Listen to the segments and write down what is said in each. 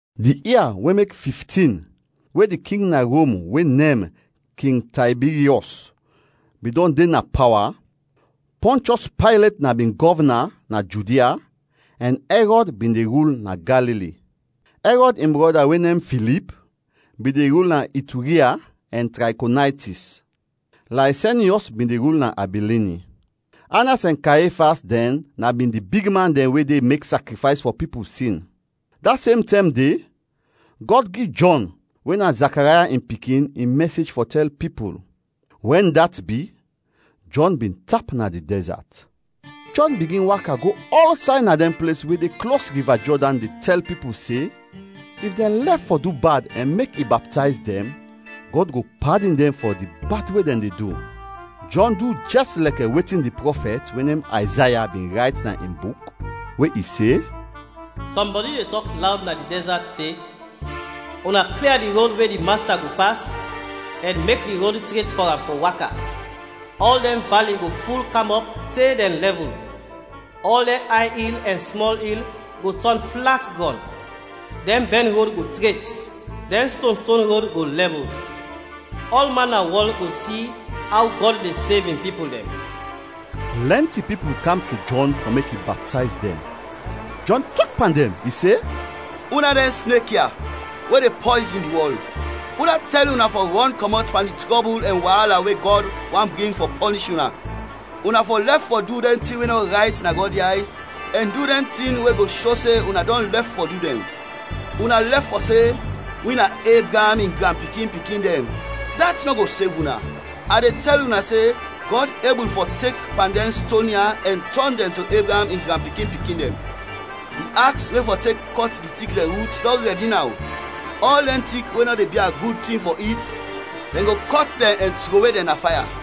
Di ia we mek fiftin we di king na Rom we nem King Taybiryɔs bin dɔn de na pawa, Pɔnchɔs Paylet na bin gɔvna na Judia ɛn Ɛrɔd bin de rul na Galili. Ɛrɔd in brɔda we nem Filip bin de rul na Ituriya ɛn Trakonaytis. Laysenyɔs bin de rul na Abilini. Anas ɛn Kayefas dɛn na bin di bigman dɛn we de mek sakrifays fɔ pipul sin. Da sem tɛm de, Gɔd gi Jɔn we na Zakaraya in pikin in mɛsej fɔ tɛl pipul. Wɛn dat bi, Jɔn bin tap na di dɛzat. Jɔn bigin waka go ɔlsay na dɛn ples we de klos Riva Jɔdan de tɛl pipul se, if dɛn lɛf fɔ du bad ɛn mek i baptayz dɛn, Gɔd go padin dɛn fɔ di bad we dɛn de du. Jɔn du jɛs lɛkɛ wetin di prɔfɛt we nem Ayzaya bin rayt na in buk, we i se: “Sɔmbɔdi de tɔk lawd na di dɛzat se, ‘Una klia di rod we di Masta go pas ɛn mek di rod tret fɔ am fɔ waka. Ɔl dɛn vali go ful kam ɔp te dɛn lɛvul, ɔl dɛn ay il ɛn smɔl il go tɔn flat grɔn. Dɛn bɛn rod go tret, dɛn stonston rod go lɛbul. Ɔlman na wɔl go si aw Gɔd de sev in pipul dɛn.’” Plɛnti pipul kam to Jɔn fɔ mek i baptayz dɛn. Jɔn tɔk pan dɛn, i se, “Una dɛn snek ya, we de pɔyzin di wɔl, udat tɛl una fɔ rɔn kɔmɔt pan di trɔbul ɛn waala we Gɔd want bring fɔ pɔnish una? Una fɔ lɛf fɔ du dɛn tin we nɔ rayt na Gɔd yay ɛn du dɛn tin we go sho se una dɔn lɛf fɔ du dɛn. Una lɛf fɔ se, ‘Wi na Ebraam in granpikin-pikin dɛn.’ Dat nɔ go sev una. A de tɛl una se Gɔd ebul fɔ tek pan dɛn ston ya ɛn tɔn dɛn to Ebraam in granpikin-pikin dɛn. Di aks we fɔ tek kɔt di tik dɛn rut dɔn rɛdi naw; ɔl dɛn tik we nɔ de bia gud tin fɔ it, dɛn go kɔt dɛn ɛn trowe dɛn na faya.”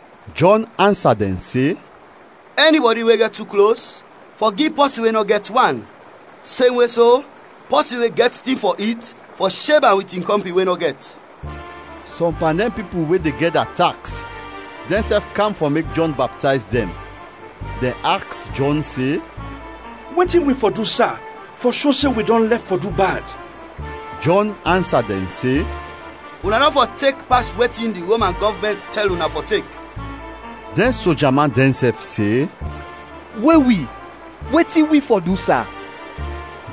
Jɔn ansa dɛn se, “Ɛnibɔdi we gɛt tu klos, fɔ gi pɔsin we nɔ gɛt, wan. Semwe so, pɔsin we gɛt tin fɔ it, fɔ sheb am wit in kɔmpin we nɔ gɛt.” Sɔm pan dɛn pipul we de gɛda taks dɛnsɛf kam fɔ mek Jɔn baptayz dɛn. Dɛn aks Jɔn se, “Wetin wi fɔ du, sa, fɔ sho se wi dɔn lɛf fɔ du bad?” Jɔn ansa dɛn se, “Una nɔ fɔ tek pas wetin di Roman gɔvmɛnt tɛl una fɔ tek.” Dɛn soja man dɛnsɛf se, “We wi, wetin wi fɔ du, sa?”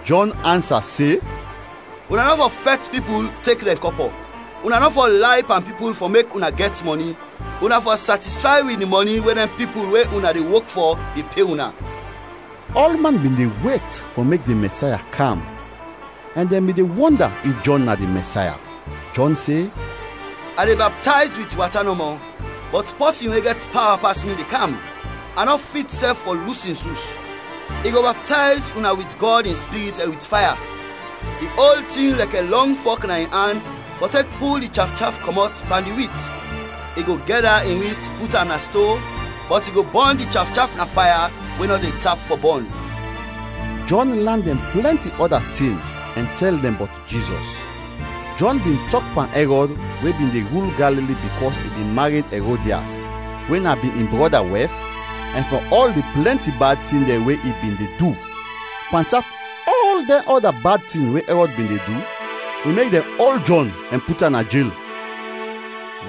Jɔn ansa se, “Una nɔ fɔ fɛt pipul tek dɛn kɔpɔ, una nɔ fɔ lay pan pipul fɔ mek una gɛt mɔni. Una fɔ satisfay wit di mɔni we dɛn pipul we una de wok fɔ de pe una.” Ɔlman bin de wet fɔ mek di Mɛsaya kam ɛn dɛn bin de wɔnda if Jɔn na di Mɛsaya. Jɔn se, “A de baptayz wit wata nɔmɔ, bɔt pɔsin we gɛt pawa pas mi de kam. A nɔ fit sɛf fɔ lus in sus. I go baptayz una wit Gɔd in Spirit ɛn wit faya. I ol tin lɛkɛ lɔng fɔk na in an fɔ tek pul di chafchaf kɔmɔt pan di wit. I go gɛda in wit put am na sto, bɔt i go bɔn di chafchaf na faya we nɔ de tap fɔ bɔn.” Jɔn lan dɛn plɛnti ɔda tin ɛn tɛl dɛn bɔt Jizɔs. Jɔn bin tɔk pan Ɛrɔd we bin de rul Galili bikɔs i bin mared Ɛrodias, we na bin in brɔda wɛf, ɛn fɔ ɔl di plɛnti bad tin dɛn we i bin de du. Pantap ɔl dɛn ɔda bad tin we Ɛrɔd bin de du, i mek dɛn ol Jɔn ɛn put am na jel!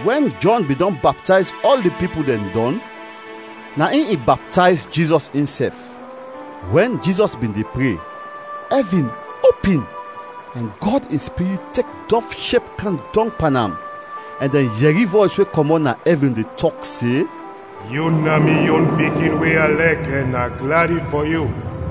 Wɛn Jɔn bin dɔn baptayz ɔl di pipul dɛn dɔn, na in i baptayz Jizɔs insɛf. Wɛn Jizɔs bin de pre, ɛvin opin ɛn Gɔd in Spirit tek dɔv shep kam dɔng pan am ɛn dɛn yɛri vɔys we kɔmɔt na ɛvin de tɔk se, “Yu na mi yon Pikin we a lɛk ɛn a gladi fɔ yu!”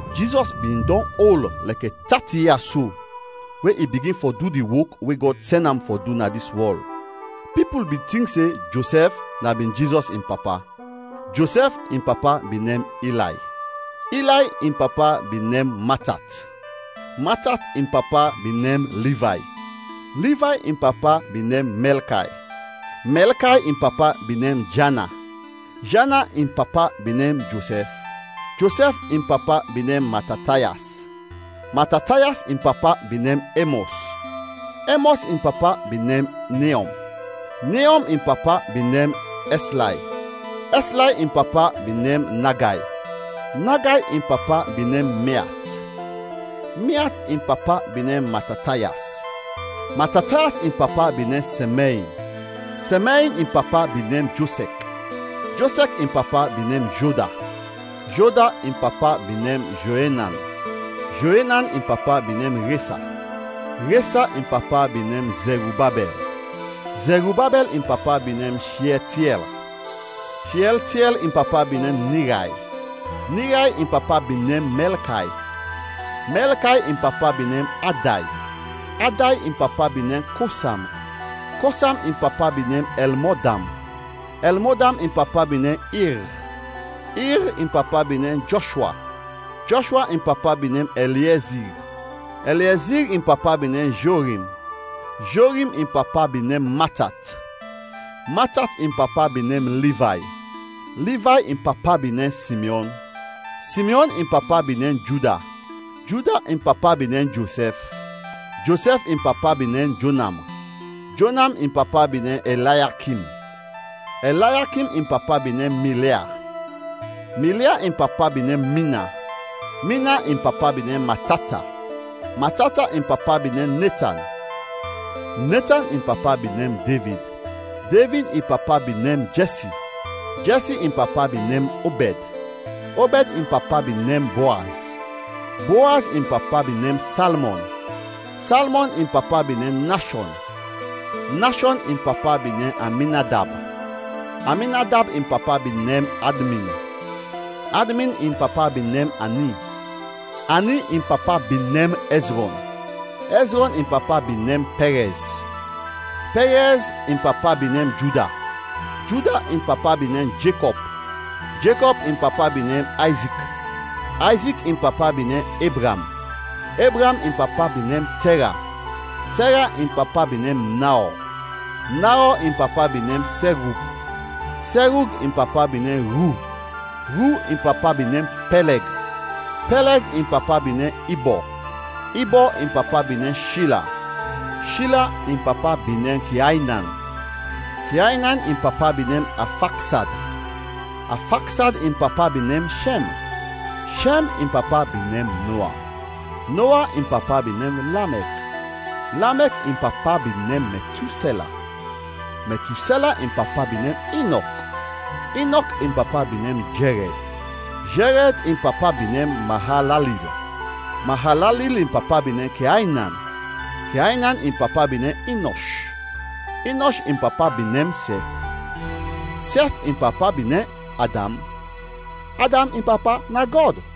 Jizɔs bin dɔn ol lɛkɛ tati ia so we i bigin fɔ du di wok we Gɔd sɛn am fɔ du na dis wɔl. Pipul bin tink se Josɛf na bin Jizɔs in papa. Josɛf in papa bin nem Ilay, Ilay in papa bin nem Matat, Matat in papa bin nem Livay, Livay in papa bin nem Mɛlkay, Mɛlkay in papa bin nem Jana, Jana in papa bin nem Josɛf, Josɛf in papa bin nem Matatayas, Matatayas in papa bin nem Emɔs, Emɔs in papa bin nem Neɔm, Neɔm in papa bin nem Ɛslay, Ɛslay in papa bin nem Nagay, Nagay in papa bin nem Meat, Meat in papa bin nem Matatayas, Matatayas in papa bin nem Sɛmɛin, Sɛmɛin in papa bin nem Josɛk, Josɛk in papa bin nem Joda, Joda in papa bin nem Joenan, Joenan in papa bin nem Resa, Resa in papa bin nem Zɛrubabɛl, Zɛrubabɛl in papa bin nem Shiɛltiɛl, Shiɛltiɛl in papa bin nem Niray, Niray in papa bin nem Mɛlkay, Mɛlkay in papa bin nem Aday, Aday in papa bin nem Kosam, Kosam in papa bin nem Ɛlmodam, Ɛlmodam in papa bin nem Ir, Ir in papa bin nem Jɔshwa, Jɔshwa in papa bin nem Ɛliezir, Ɛliezir in papa bin nem Jorim, Jorim in papa bin nem Matat, Matat in papa bin nem Livay, Livay in papa bin nem Simyɔn, Simyɔn in papa bin nem Juda, Juda in papa bin nem Josɛf, Josɛf in papa bin nem Jonam, Jonam in papa bin nem Ɛlayakim, Ɛlayakim in papa bin nem Milɛa, Milɛa in papa bin nem Mina, Mina in papa bin nem Matata, Matata in papa bin nem Netan, Netan in papa bin nem Devid, Devid in papa bin nem bin Jɛsi, Jɛsi in papa bin nem Obɛd, Obɛd in papa bin nem Boaz, Boaz in papa bin nem Salmɔn, Salmɔn in papa bin nem Nashɔn, Nashɔn in papa bin nem Aminadab, Aminadab in papa bin nem Admin, Admin in papa bin nem Ani, Ani in papa bin nem Ɛzrɔn, Ɛzrɔn in papa bin nem Pɛrɛz, Pɛrɛz in papa bin nem Juda, Juda in papa bin nem Jekɔb, Jekɔb in papa bin nem Ayzik, Ayzik in papa bin nem Ebraam, Ebraam in papa bin nem Tɛra, Tɛra in papa bin nem Naɔ, Naɔ in papa bin nem Serug, Serug in papa bin nem Ru, Ru in papa bin nem Peleg, Peleg in papa bin nem Ibɔ, Ibɔ in papa bin nem Shila, Shila in papa bin nem Keaynan, Keaynan in papa bin nem Afaksad, Afaksad in papa bin nem Shɛm, Shɛm in papa bin nem Noa, Noa in papa bin nem Lamɛk, Lamɛk in papa bin nem Metusɛla, Metusɛla in papa bin nem Inɔk, Inɔk in papa bin nem Jerɛd, Jerɛd in papa bin nem Maalalil, Maalalil in papa bin nem Keaynan, Keaynan in papa bin nem Inɔsh, Inɔsh in papa bin nem Sɛth, Sɛth in papa bin nem Adam, Adam in papa na Gɔd.